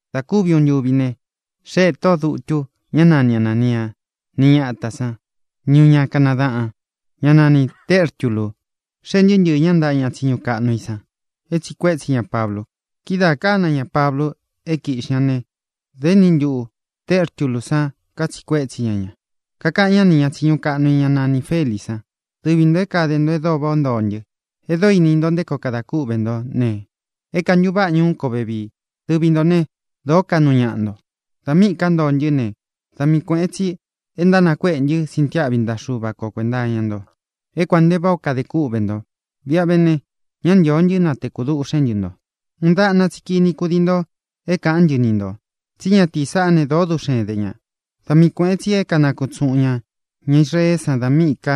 Dā kúvi uꞌun ntúvi ne, xéē tóꞌō dutu, ñá nani Anānia, ni ñátā sán, ni uun ña kanadaꞌān, ñá nani Tērtulu. Xéē ntɨɨ́ ntɨɨ̄ ñá ntaꞌa ña tsiñu kaꞌnu i san é tsīꞌi kuétsi ña Pablu. Kidáā kána ña Pablu é kīꞌxi ña ne, da éni ntuꞌu Tērtulú san katsiꞌi kuétsi ña ña. Kakaꞌan ñá nī ña tsiñu kaꞌnu i, ñá nanī Felí san: —Dɨvi ntō é kāde nto e dóo váꞌā ó ntoo ntɨ. E dóo ini nto nté koo kadā kúꞌve nto ne, é kantuváꞌa ñuu kó vevii. Dɨvi ntō né, dōó kaꞌnu ñáꞌa nto. Dā míꞌī ká ntoo ntɨ́ ne, da mii kuēꞌen tsi e ntánakuéꞌe ntɨ́ sintiáꞌvi ntaꞌa Xuva ko kuēnta iña nto, é kuān nte váꞌā ó kade kúꞌvē nto. Viꞌa ve ne, ñá ntīo ntɨ́ natekū duꞌxén ntɨ nto. Uun daꞌna tsi kini kudii nto é kāꞌán ntɨ ni ntō. Tsí ñatīí saꞌá ne, dōó duꞌxen de ñā. Da mii kuēꞌen tsi é kanakutsuꞌun ñā ña Israeé san dā míꞌī ká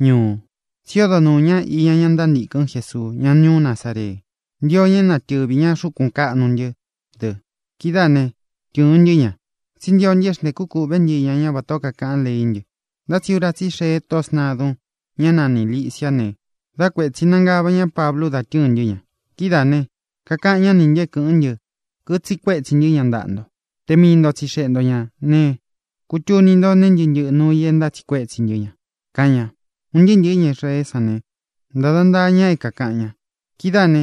ñuu. Tsí odo nuū ñá iña ña ntántīkɨn Jésuu, ñá ñuú Nazaree. Ntío ña é natɨvi ñā xúkun kāꞌnu ntɨ́ dɨ. Kidáā né, tɨ̄ɨn ntɨ́ ña. Tsí ntio ntɨ é xntēkú kūꞌvé ntɨ iña ñá vatā ó kakaꞌan leí ntɨ. Ntá tsi ura tsí i xee tóꞌō sntadun, ñá nanī Lisiá ne, dá kuētsi nangava ñá Pablu da tɨ́ɨ̄n ntɨ́ ña. Kidáā ne, kakaꞌan ñá nī ntɨ é kɨ̄ꞌɨ́n ntɨ, kitsiꞌi kuétsi ntɨ́ ña ntaꞌa nto. Te mii nto tsixeꞌe nto ñā ne, kutuni nto nee ntɨ́ꞌɨ ntɨꞌɨ nuū i é ntátsiꞌi kuétsi ntɨ́ ña —kaꞌan ña. Un ntɨɨ́ ntɨ̄ɨ́ ña Israeé san ne, ntāda ntaa ña é kākaꞌan ña. Kidáā ne,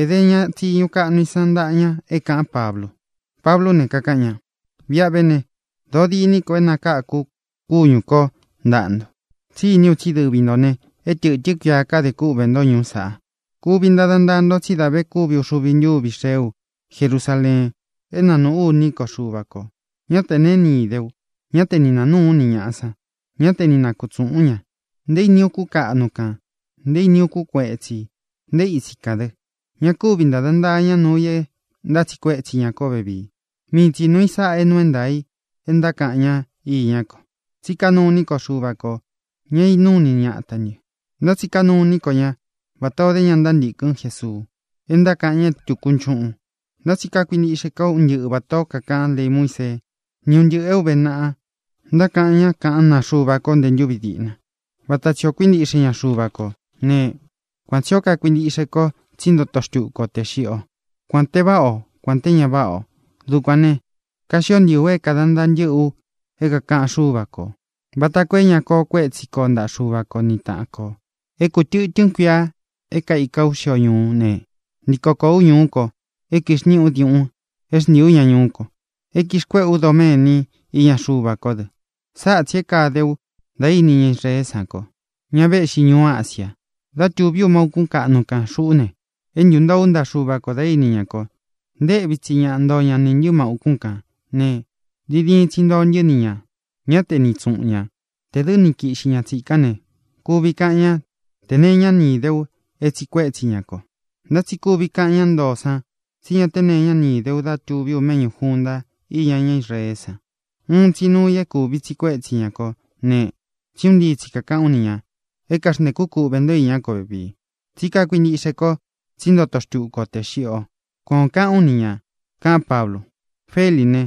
ēde ña tsiñu kaꞌnu i san ntáꞌa ña é kāꞌán Pablu. Pablú ne, kakaꞌan ña: —Viꞌa ve ne, dōo diní ko é nakākú u kúñū kó ntaꞌa nto, tsí iní u tsí dɨvi ntō ne, é tɨ̄tɨ́n kuia kadē kúꞌvē ntó ñuú saꞌa. Kuvi ntada ntaa nto tsí da ve kúvi uxuvi ntúvi xee ú Jerusaleen é nanuꞌu ú iní ko Xuva kō. Ñá tē neé ni īde u. Ñá te ni nāa núū ú ni ñāꞌa san; ñá te ni nakutsuꞌūn ú ña, nté ini ukún kaꞌnu kan, nté ini ukún kuetsī, nté itsi kān dɨ. Ña kúvi ntāda ntaa ña nuu i é ntátsiꞌi kuétsi ña kó vevii. Mii tsi nuū i sáꞌā é nuu é ntaā i é ntákaꞌan ña iñá ko: Tsí kanuu iní ko Xuva kō, ña é inúu ini ñatā ntɨ́, ntá tsi kanuu iní ko ña vatā ó de ña ntántīkɨn Jésuu, é ntákaꞌan ña é tūku nchuꞌun. Ntá tsi kakuintiꞌxe ko un ntɨꞌɨ vatā ó kakaꞌan lei Muísee ni ún ntɨꞌɨ̄ é ūve naꞌa, ntákaꞌan ñá kaꞌán naa Xuva ko nté ntūvi diꞌna. Vata tsī ó kuintiꞌxe ña Xuva kō né, kuan tsī ó kakuintiꞌxe kó tsí ntoto xtúku o tē xiꞌi ó, kuān te váꞌa o, kuān té ña váꞌa ō. Dukuān ne, kaxió ntii u é kāda ntaa ntɨ́ꞌɨ u é kākaꞌan Xúva kō, vata koo é ña koo kuétsi ko ntaꞌa Xuva ko ni tāꞌan ko. ʼÉ kū tɨtɨ́n kuia é kaika ú xio ñuú ne, ntiko kōó u ñuú ko é kixnīꞌí u diuꞌun é xntiī ú ña ñuú ko, é kixkuéꞌe ú doméni iña Xuva kó dɨ. Sáꞌa tsī é kāde ú da íni ña Israeé san kó, ña véꞌxi ñuú Asia, dá tūví u má ūkún kaꞌnu kān. Xuꞌú ne, é ntūntoo ú ntaꞌa Xuva kō dá ini ña ko. Nteꞌvi tsi ñaꞌa ntoo ña nī ntɨ́ má ūkún kān ne, diin diin tsi ntoo ntɨ́ ni ñā; ñá te ni itsuꞌun ñā. Tē dɨ́ ni kiꞌxi ña tsīkán ne, kuvi kaꞌan ñá te nee iñá ni īdé u é tsīꞌi kuétsi ña ko. Ntá tsi kuvi kaꞌan ñá ntoo san tsí ña te nee iñá ni īdé u dá tūví u méꞌñū junta iña ñá Israeé san. Uun tsi nuu i é kúvi tsiꞌi kuétsi ñā kó ne: tsí un ntii tsi kākaꞌán u ni ñā: “É kaxntēkú kuꞌvē nto iñá ko vevii, tsí kakuintiꞌxe ko tsí ntoto xtuku o tē xiꞌi o.” Kuan ō kaꞌán u ni ñā —kaꞌán Pablu. Felí ne,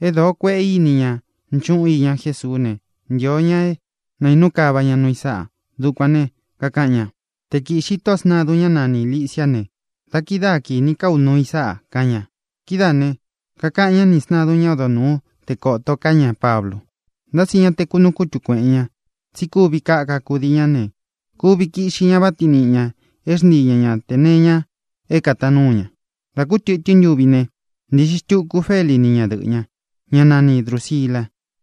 é dōo kueꞌe íni ña nchuꞌun iña Jésuú ne, ntio ña é nainú kava ña nuu i sáꞌa. Dukuān ne, kakaꞌan ña: —Te kīꞌxi tóꞌō sntadun, ñá nanī Lisiá ne, da kidáa kīní ka ú nuu i sáꞌa —kaꞌan ña. Kidáā ne, kakaꞌan ñá nī sntadun ñá odo nūú te kōto ká ña Pablu, ntá tsi ñá te kunuu kutu kuēꞌen ña, tsí kuvi kaka kudii ña ne, kuvi kiꞌxi ña váꞌa tiin niꞌi ñā é xntii ña ña tē nee iña é kātaan núu ña. Dā kú tɨtɨ́n ntuvi ne, ntīꞌxi xtuku Feli ni ñadɨꞌɨ́ ña, ñá nani Drūsila.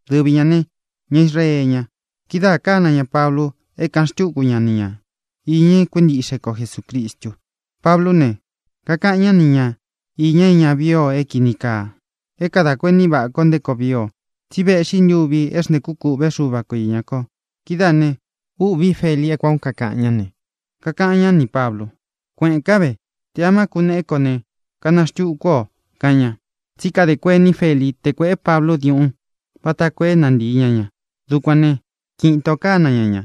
Dɨvi ñā ne, ña Israee ña. Kidáā kána ña Pablu é kāꞌan xtúku ña ni ña īña é kuintiꞌxe ko Jesūcristu. Pablú ne, kakaꞌan ñá ni ña īña é ña vií ō é kīni kaa, é kadā kuení vaꞌa kó nté koo vii o, tsi véꞌxi ntuvi é xntēkú kūꞌvé Xuva ko īña ko. Kidáā ne, ûꞌví Feli é kuān ó kakaꞌan ñá ne, kakaꞌan ñá nī Pablu: —Kuéꞌēn kán ve. Tē amá kuneꞌé ko ne, kana xtukú u o —kaꞌan ña. Tsí kadē kuení Feli te kuéꞌe Pablu diuꞌun vata koo é nantīi ña ña. Dukuān ne, kiꞌin itō kána ña ña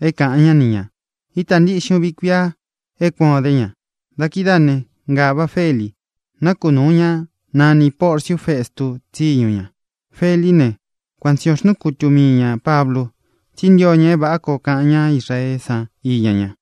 é kāꞌan ñá ni ñā. Ítā ntiꞌxin uvi kuia é kuan ō dé ña. Da kidáā ne, ngāvá Feli, nákunūu ñá nanī Porciu Festu tsíñu ña. Felí ne, kuan tsī ó xnúu kutu mii ñā Pablu, tsí ntio ña é vāꞌá koo kaꞌan ñá Israeé san iña ña.